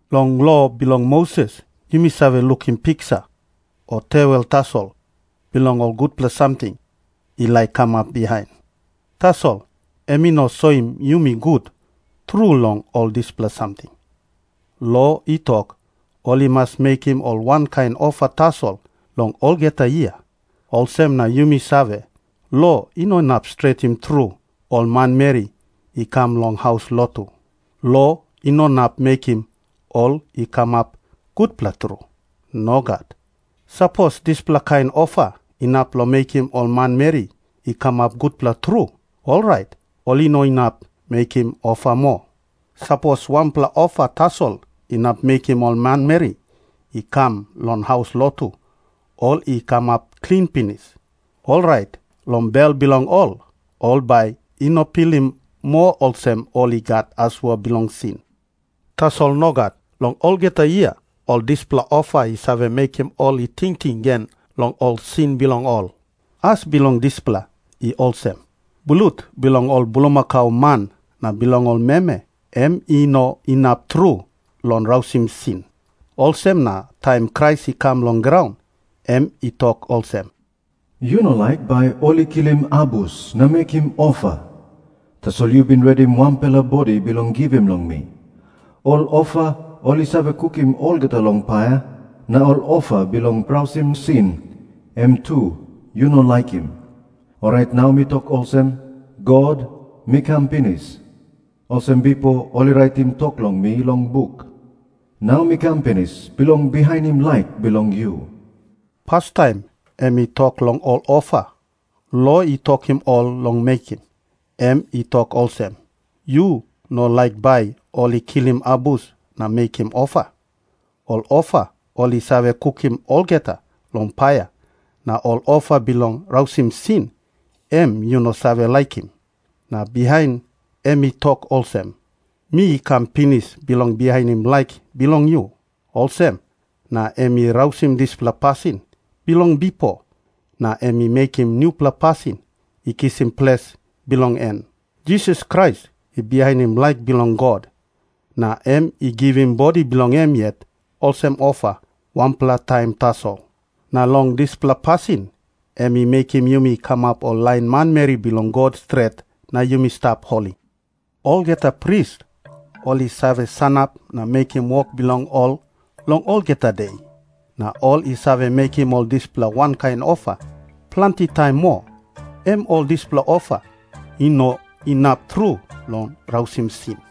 Long lo bilong Moses yumi save lukim piksa o tewel tasol bilong ol gutpela samting i laik kamap bihain. Tasol em i no soim yumi gut tru long ol dispela samting. Lo i tok, ol i mas mekim ol wankain ofa tasol long olgeta yia, olsem na yumi save, lo i no inap stretim tru ol manmeri i kam long haus lotu. Lo i no inap mekim ol i kamap gutpela tru. Nogat. Sapos dispela kain ofa inap long mekim ol manmeri i kamap gutpela tru, orait ol i no inap mekim ofa moa. Sapos wanpela ofa tasol inap mekim ol manmeri i kam long haus lotu ol i kamap klin pinis, orait long bel bilong ol, ol bai i no pilim moa olsem ol i gat asua bilong sin. Tasol nogat. Long olgeta yia, ol dispela ofa i save mekim ol i tingting gen long ol sin bilong ol. As bilong dispela i olsem. Blut bilong ol bulmakau man na bilong ol meme, em i no inap tru long tekewe sin. Olsem na taim Krais i kam long graun, em i tok olsem, "Yu no laik bai ol i kilim abus na mekim ofa. Tasol yu bin redim wanpela bodi bilong givim long mi. Ol ofa ol i save kukim olgeta long paia, na ol ofa bilong tekewe sin, em tu yu no laikim. Orait nau mi tok olsem, 'God, mi kam pinis. Olsem bipo ol i raitim tok long mi long buk. Nau mi kam pinis bilong bihainim laik bilong yu.'" Pastaim em i tok long ol ofa lo i tokim ol long mekim. Em i tok olsem, "Yu no laik bai ol i kilim abus na mekim ofa. Ol ofa ol i save kukim olgeta long paia na ol ofa bilong tekewe sin, em yu no save laikim." Na bihain em i tok olsem, "Mi kam pinis bilong bihainim laik bilong yu." Olsem na em i rausim dispela pasin bilong bipo, na em i mekim nupela pasin i kisim ples bilong en. Jisas Krais i bihainim laik bilong God, na em i givim bodi bilong em yet olsem ofa wanpela taim tasol. Na long dispela pasin em i mekim yumi i kamap ol lain manmeri bilong God stret na yumi stap holi. Olgeta pris ol i save sanap na mekim wok bilong ol long olgeta de. Na ol i save mekim ol dispela wankain ofa planti taim moa, em ol dispela ofa i no inap tru long tekewe sin.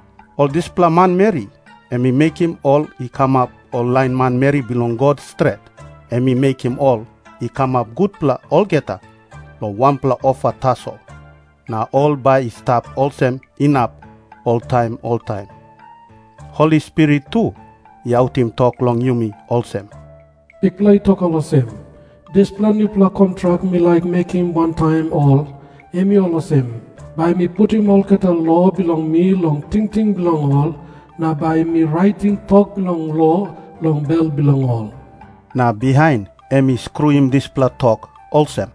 Ol dispela manmeri em i mekim ol i kamap ol lain manmeri bilong God stret, em i mekim ol i kamap gutpela olgeta long wanpela ofa tasol, na ol bai i stap olsem inap oltaim oltaim. Holi Spirit tu i autim tok long yumi olsem, "Bikpela i tok olsem, 'Dispela nupela kontrak mi laik mekim wantaim ol, em i olsem. Bai mi putim olgeta lo bilong mi long tingting bilong ol na bai mi raitim tok bilong lo long bel bilong ol.' " Na bihain em i skruim dispela tok olsem,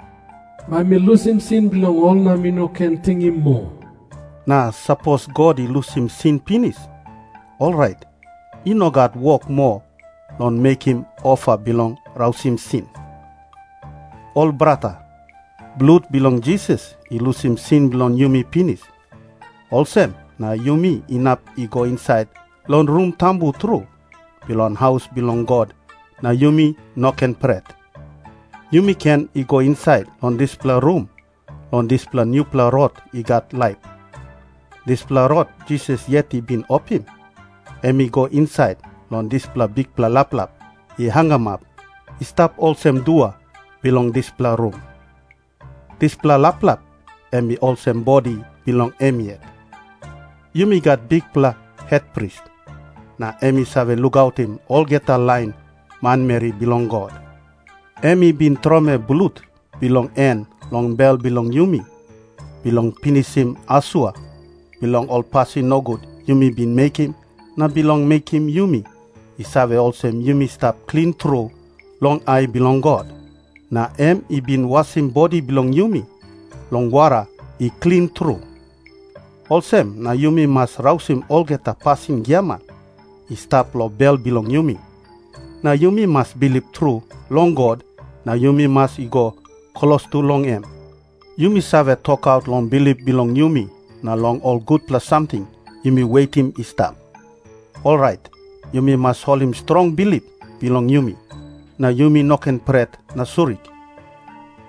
"Bai mi lusim sin bilong ol na mi no ken tingim moa." Na sapos God i lusim sin pinis, orait i no gat wok moa long mekim ofa bilong tekewe sin. Ol brata, blut bilong Jisas i lusim sin bilong yumi pinis, olsem na yumi inap i go insait long Rum Tambu Tru bilong haus bilong God na yumi no ken pret. Yumi ken i go insait long dispela rum long dispela nupela rot i gat laip. Dispela rot Jisas yet i bin opim, em i go insait long dispela bikpela laplap i hangamap i stap olsem dua bilong dispela rum. Dispela laplap em i olsem bodi bilong em yet. Yumi gat bikpela hetpris, na em i save lukautim olgeta lain manmeri bilong God. Em i bin tromoi blut bilong en long bel bilong yumi, bilong pinisim asua bilong ol pasin nogut yumi bin mekim na bilong mekim yumi i save olsem yumi stap klin tru long ai bilong God. Na em i bin wasim bodi bilong yumi long wara i klin tru. Olsem na yumi mas rausim olgeta pasin giaman i stap long bel bilong yumi, na yumi mas bilip tru long God na yumi mas i go klostu long em. Yumi save tokaut long bilip bilong yumi na long ol gutpela samting yumi wetim i stap. Orait yumi mas holim strong bilip bilong yumi, na yumi no ken pret na surik.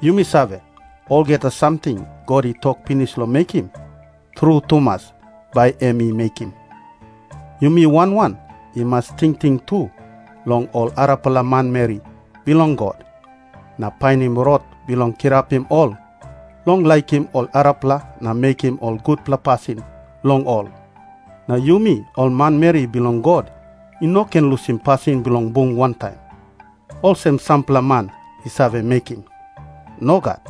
Yumi save, olgeta samting God i tok pinis long mekim, tru tumas bai em i mekim. Yumi wan wan i mas tingting tu long ol arapela manmeri bilong God, na painim rot bilong kirapim ol long laikim ol arapela na mekim ol gutpela pasin long ol. Na yumi ol manmeri bilong God i no ken lusim pasin bilong bung wantaim, olsem sampela man i save mekim. Nogat.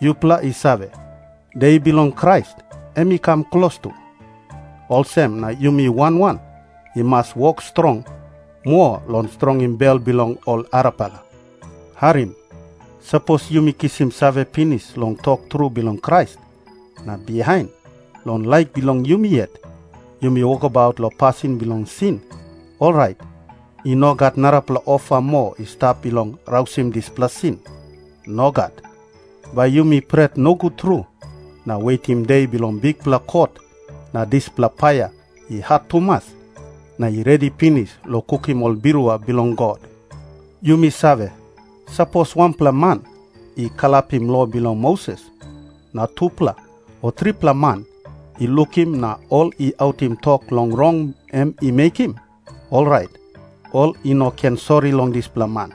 Yupela i save, De bilong Krais em i kam klostu. Olsem na yumi wan wan i mas wok strong moa long strongim bel bilong ol arapela. Harim. Sapos yumi kisim save pinis long tok tru bilong Krais, na bihain, long laik bilong yumi yet yumi wokabaut long pasin bilong sin, orait i no gat narapela ofa moa i stap bilong tekewe dispela sin. Nogat. Bai yumi pret nogut tru na wetim de bilong bikpela kot na dispela paia i hat tumas na i redi pinis long kukim ol birua bilong God. Yumi save, sapos wanpela man i kalapim lo bilong Moses, na tupela o tripela man i lukim na ol i autim tok long rong em i mekim, orait ol i no ken sori long dispela man.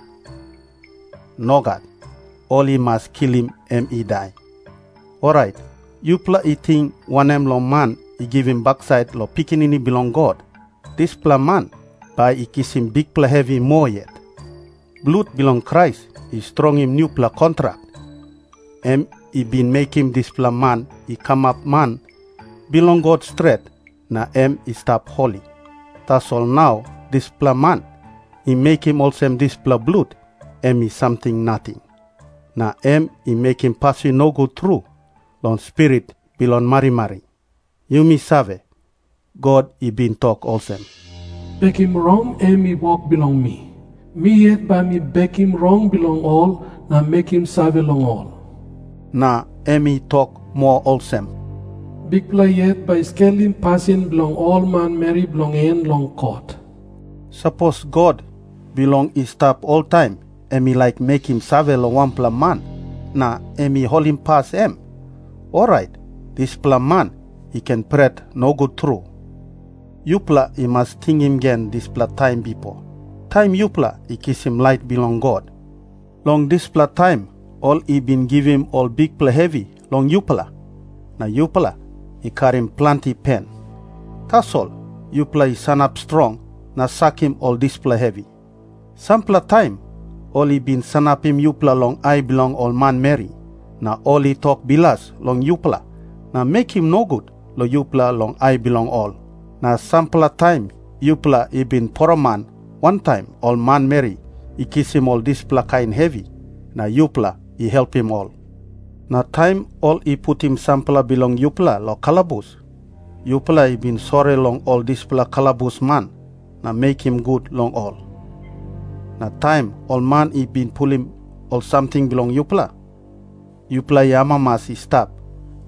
Nogat. Ol i mas kilim em i dai. Orait yupela i ting wanem long man i givim baksait long Pikinini Bilong God? Dispela man bai i kisim bikpela hevi moa yet. Blut bilong Krais i strongim nupela kontrak, em i bin mekim dispela man i kamap man bilong God stret na em i stap holi. Tasol nau dispela man i mekim olsem dispela blut em i samting nating. Na em i mekim pasin nogut tru long Spirit bilong marimari. Yumi save, God i bin tok olsem, "Bekim rong, em i wok bilong mi. Mi yet bai mi bekim rong bilong ol na mekim save long ol." Na em I tok moa olsem, "Bikpela yet bai i skelim pasin bilong ol manmeri bilong en long kot." Sapos God bilong i stap oltaim emi laik mekim save long wanpela man na em i holimpas em, orait dispela man i ken pret nogut tru. Yupela i mas tingim gen dispela taim bipo, taim yupela i kisim lait bilong God. Long dispela taim ol i bin givim ol bikpela hevi long yupela, na yupela i karim planti pen. Tasol yupela i sanap strong na sakim ol dispela hevi. Sampela taim ol i bin sanapim yupela long ai bilong ol manmeri, na ol i tok bilas long yupela na mekim nogut long yupela long ai bilong ol. Na sampela taim yupela i bin poroman wantaim ol manmeri i kisim ol dispela kain hevi,na yupela i helpim ol. Na taim ol i putim sampela bilong yupela long kalabus, yupela i bin sori long ol dispela kalabusman na mekim gut long ol. Na taim ol man i bin pulim ol samting bilong yupela, yupela i amamas i stap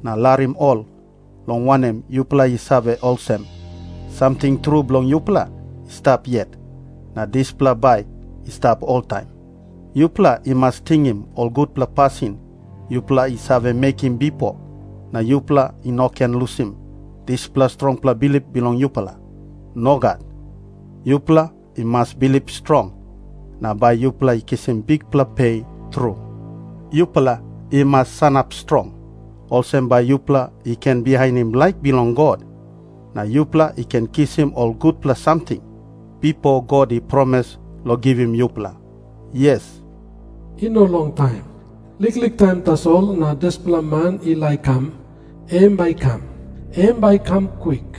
na larim ol, long wanem, yupela i save olsem, samting tru bilong yupela i stap yet, na dispela bai i stap oltaim. Yupela i mas tingim ol gutpela pasin yupela i save mekim bipo na yupela i no ken lusim dispela strongpela bilip bilong yupela. Nogat. Yupela i mas bilip strong, na bai yupela i kisim bikpela pe tru. Yupela i mas sanap strong, olsem bai yupela i ken bihainim laik bilong God. Na yupela i ken kisim ol gutpela samting, bipo God i promis long givim yupela. Yes, "I no longtaim. Liklik taim tasol, na dispela man i laik kam, em bai i kam. Em bai i kam kwik.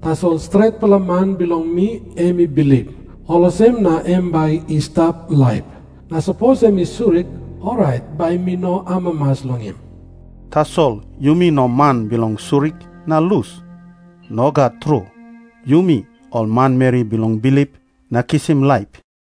Tasol stretpela man bilong mi em i bilip, olsem na em bai i stap laip. Na sapos em i surik, orait bai mi no amamas long em." Tasol yumi no man bilong surik na lus. Nogat tru. Yumi ol manmeri bilong bilip na kisim laip.